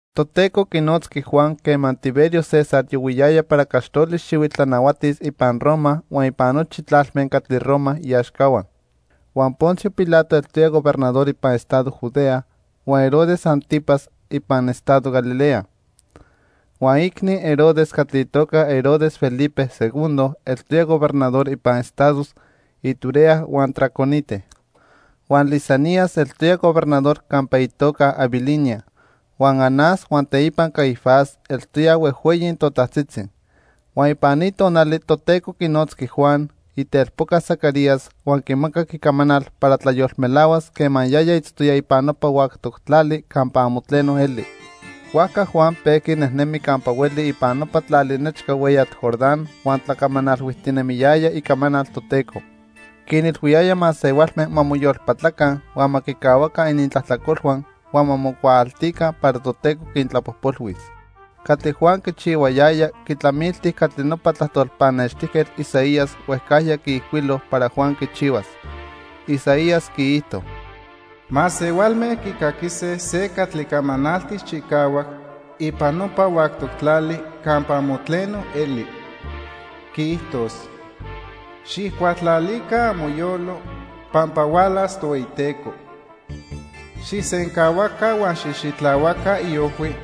Toteco quinotzqui Juan quema Tiberio César yohuiyaya para caxtoli xihuitl tlanahuatis ipan Roma huan ipan nochi tlalme catli Roma iaxcahua. Huan Poncio Pilato eltoya gobernador ipan estado Judea, huan Herodes 'Antipas ipan estado Galilea. Huan iicni Herodes catli itoca Herodes Felipe II eltoya gobernador ipan estados Iturea huan Traconite. Huan Lisanias eltoya gobernador campa itoca Abilinia. Huan Anás huan teipa Caifás eltoyaj huejhueyi totajtzitzi. Huan ipan ni tonali Toteco quinotzqui Juan, itelpoca Zacarías, huan quimacac icamanal para tlayolmelahuas quema yaya itztoya ipan nopa huactoc tlali campa amo tleno eli. Huajca Juan pejqui nejnemi campa hueli ipan nopa tlali nechca hueyatl Jordán huan tlacamanalhuijtinemiyaya icamanal Toteco. Quinilhuiyaya masehualme ma moyolpatlaca, huan ma quicahuaca inintlajtlacolhua huan ma mocuaaltica para Toteco quintlapojpolhuis. Catli Juan quichihuayaya quitlamilti catli nopa tlajtol pannextijquetl Isaías huejcajya quiijcuilo para Juan quichihuas. Isaías quiijto: "Masehualme quicaquise se catli camanaltis chicahuac ipan nopa huactoc tlali campa amo tleno eli. Quiijtos: 'Xijcualtlalica amoyolo pampa hualas Tohueyiteco. Xijsencahuaca huan xijxitlahuaca iojhui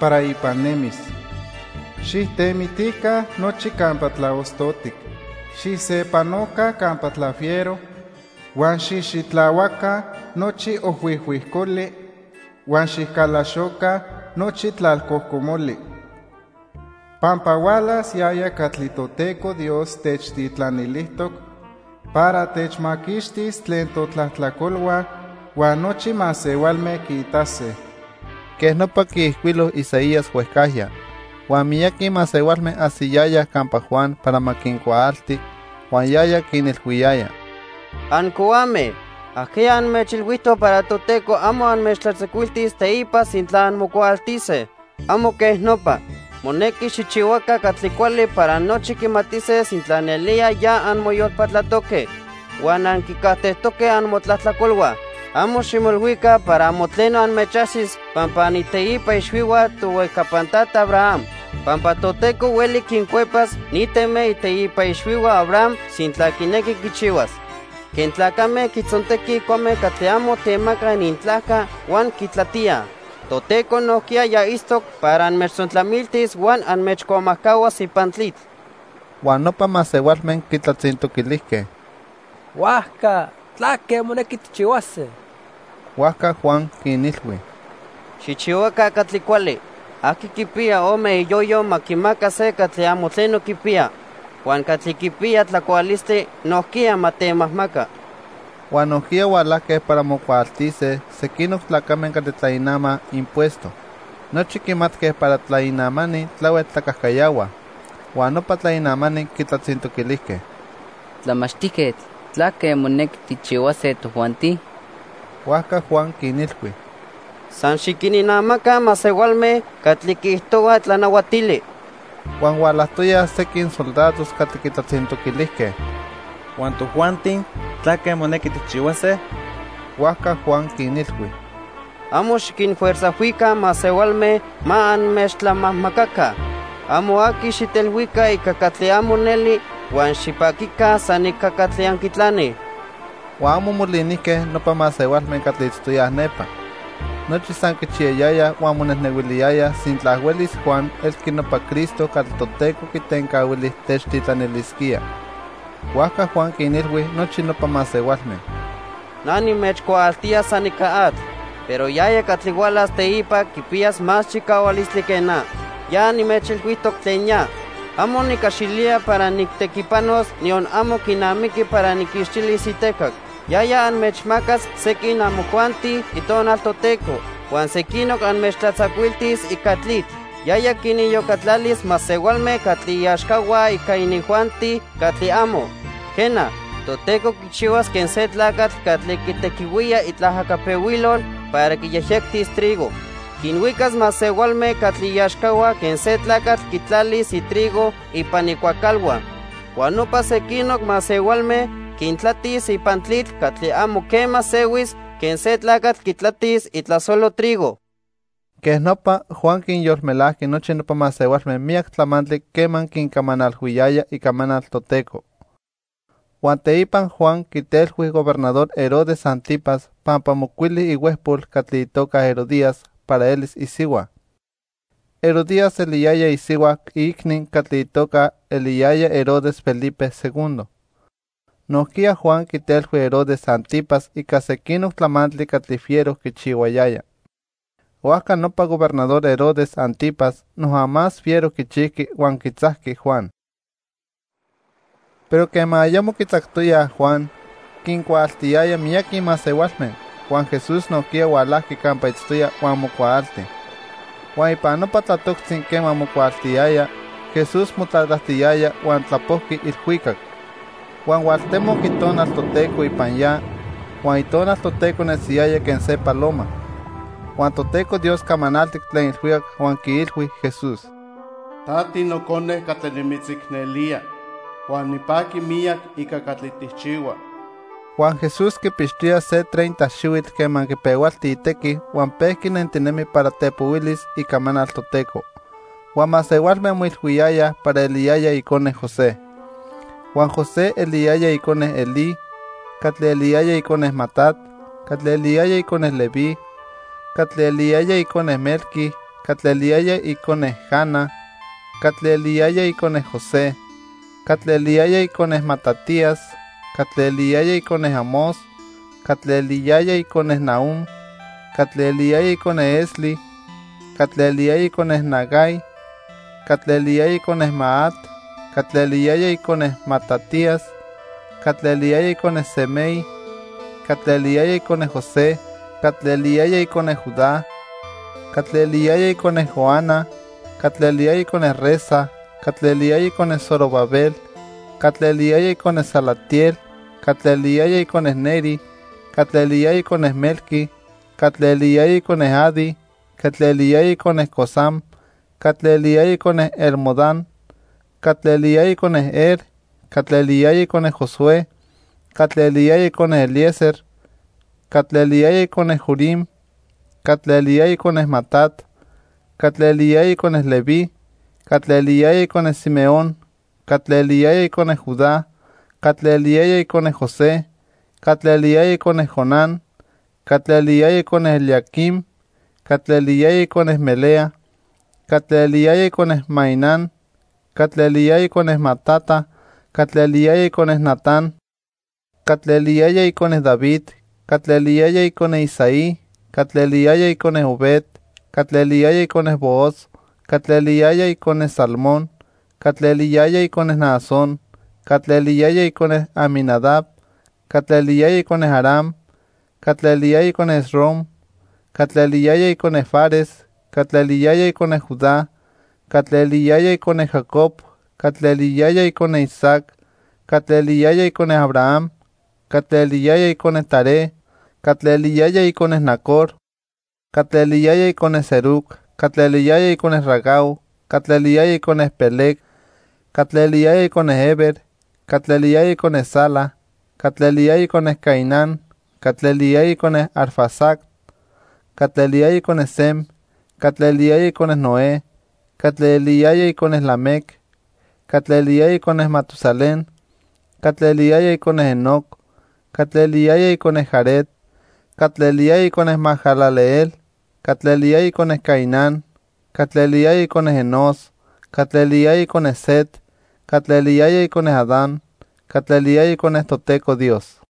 para ipan nemis. Xijtemitica nochi campa tlaostotic. Xijsepanoca campa tlafiero, huan xijxitlahuaca nochi ojhuijhuijcoli, huan xicalaxoca nochi tlalcojcomoli. Pampa hualas yaya catli Toteco Dios techtitlanilijtoc para techmaquixtis tlen totlajtlacolhua, huan nochi masehualme quiitase.' " Quej nopa quiijcuilo Isaías huejcajya. Huan miyaqui masehualme ajsiyayaj campa Juan para ma quincuaalti, huan yaya quinilhuiyaya: —Ancohuame. ¿Ajqueya anmechilhuijtoc para Toteco amo anmechtlatzacuiltis teipa sintla anmocuaaltise? Amo quej nopa. Monequi xijchihuaca catli cuali para nochi quimatise sintla nelía ya anmoyolpatlatoque huan anquicajtejtoque amotlajtlacolhua. Amo ximoilhuica para amo tleno anmechajsis pampa aniteipa ixhuihua tohuejcapan tata Abraham, pampa Toteco hueli quincuepas ni teme iteipa ixhuihua Abraham sintla quinequi quichihuas. Quen tlacame quitzontequij cuame catli amo temacaj inintlajca huan quintlatíaj, Toteco nojquiya ya itztoc para anmechtzontlamiltis huan anmechcuamajcahuas ipan tlitl. Huan nopa masehualme quitlatzintoquilijque: —Huajca, ¿tlaque monequi tijchihuase? Huajca Juan quinilhui: —Xijchihuaca catli cuali. Aqui quipiya ome iyoyo ma quimaca se catli amo tleno quipiya. Huan catli quipiya tlacualistli nojquiya ma temajmaca. Huan nojquiya hualajque para mocuaaltise sequinoc tlacame catli tlainamaj impuesto. Nochi quimatque para tlainamani tlahuel tlacajcayahuaj. Huan nopa tlainamani quitlatzintoquilijque: —Tlamachtijquetl, ¿tlaque monequi tijchihuase tojuanti? Huajca Juan quinilhui: —San xiquininamaca masehualme catli quiijtohua tlanahuatili. Huan hualajtoyaj sequin soldados catli quitlatzintoquilijque: —Huan tojuanti, ¿tlaque monequi tijchihuase? Huajca Juan quinilhui: —Amo xiquinfuerzajhuica masehualme ma anmechtlamajmacaca. Amo aqui xijtelhuica ica catli amo neli huan xipaquica san ica catli anquitlanij. Huan amo molinijque nopa masehualme catli itztoyaj nepa. Nochi san quichiyayayaj huan monejnehuiliyayaj sintla huelis Juan elqui nopa Cristo catli Toteco quitencahuili techtitlanilisquía. Huajca Juan quinilhui nochi nopa masehualme: —Na nimechcuaaltía san ica atl, pero yaya catli hualas teipa quipiyas más chicahualistli que na. Ya nimechilhuijtoc tlen ya. Amo nicaxilía para nijtequipanos, niyon amo quinamiqui para nijquixtilis itecac. Yaya anmechmacas sequin amojuanti Itonal Toteco huan sequinoc anmechtlatzacuiltis ica tlitl. Yaya quiniyocatlalis masehualme catli iaxcahua ica inijuanti catli amo. Quena, Toteco quichihuas quen se tlacatl catli quitequihuía itlaajacapehuilol para quiyejyectis trigo. Quinhuicas masehualme catli iaxcahua quen se tlacatl quitlalis itrigo ipan icuacalhua. Huan nopa sequinoc masehualme quintlatis ipan tlitl catli amo quema sehuis quen se tlacatl quitlatis itlasolo trigo. Quej nopa, Juan quinyolmelajqui nochi nopa masehualme miyac tlamantli quema quincamanalhuiyaya icamanal Toteco. Huan teipa Juan quitelhui Gobernador Herodes 'Antipas pampa mocuili ihuejpol catli itoca Herodías para elis isihua. Herodías eliyaya isihua iicni catli itoca eliyaya Herodes Felipe II. Nojquiya Juan quitelhui Herodes 'Antipas ica sequinoc tlamantli catli fiero quichihuayaya. Huajca nopa Gobernador Herodes 'Antipas noja más fiero quichijqui huan quitzajqui Juan. Pero quema ayamo quitzactoyaj Juan, quincuaaltiyaya miyaqui masehualme, huan Jesús nojquiya hualajqui campa itztoya huan mocuaalti. Huan ipan nopa tlatoctzi quema mocuaaltiyaya, Jesús motlatlajtiyaya huan tlapojqui ilhuicac. Huan hualtemoc Itonal Toteco ipan ya. Huan Itonal Toteco nesiyaya quen se paloma. Huan Toteco Dios camanaltic tlen ilhuicac huan quiilhui Jesús: —Ta tiNocone catli nimitzicnelía huan nipaqui miyac ica catli tijchihua. Huan Jesús quipixtoya se treinta xihuitl quema quipehualti itequi huan pejqui nentinemi para tepohuilis icamanal Toteco. Huan masehualme moilhuiyayaj para eliyaya icone José. Huan José eliyaya icone Elí, catli eliyaya icone Matat, catli eliyaya icone Leví, catli eliyaya icone Melqui, catli eliyaya icone Jana, catli eliyaya icone José, catli eliyaya icone Matatías, catli eliyaya icone Amós, catli eliyaya icone Nahúm, catli eliyaya icone Esli, catli eliyaya icone Nagai, catli eliyaya icone Maat, catli eliyaya icone Matatías, catli eliyaya icone Semei, catli eliyaya icone José, catli eliyaya icone Judá, catli eliyaya icone Joana, catli eliyaya icone Resa, catli eliyaya icone Zorobabel, catli eliyaya icone Salatiel, catli eliyaya icone Neri, catli eliyaya icone Melqui, catli eliyaya icone Adi, catli eliyaya icone Cosam, catli eliyaya icone Elmodam, catli eliyaya icone Er, catli eliyaya icone Josué, catli eliyaya icone Eliezer, catli eliyaya icone Jorim, catli eliyaya icone Matat, catli eliyaya icone Leví, catli eliyaya icone Simeón, catli eliyaya icone Judá, catli eliyaya icone José, catli eliyaya icone Jonán, catli eliyaya icone Eliaquim, catli eliyaya icone Melea, catli eliyaya icone Mainán, catli eliyaya icone Matata, catli eliyaya icone Natán, catli eliyaya icone David, catli eliyaya icone Isaí, catli eliyaya icone Obed, catli eliyaya icone Booz, catli eliyaya icone Salmón, catli eliyaya icone Naasón, catli eliyaya icone Aminadab, catli eliyaya icone Aram, catli eliyaya icone Esrom, catli eliyaya icone Fares, catli eliyaya icone Judá, catli eliyaya icone Jacob, catli eliyaya icone Isaac, catli eliyaya icone Abraham, catli eliyaya icone Taré, catli eliyaya icone Nacor, catli eliyaya icone Serug, catli eliyaya icone Ragau, catli eliyaya icone Peleg, catli eliyaya icone Heber, catli eliyaya icone Sala, catli eliyaya icone Cainán, catli eliyaya icone Arfaxad, catli eliyaya icone Sem, catli eliyaya icone Noé, catli eliyaya icone Lamec, catli eliyaya icone Matusalén, catli eliyaya icone Enoc, catli eliyaya icone Jared, catli eliyaya icone Mahalaleel, catli eliyaya icone Cainán, catli eliyaya icone Enós, catli eliyaya icone Set, catli eliyaya icone Adán, catli eliyaya icone Toteco Dios.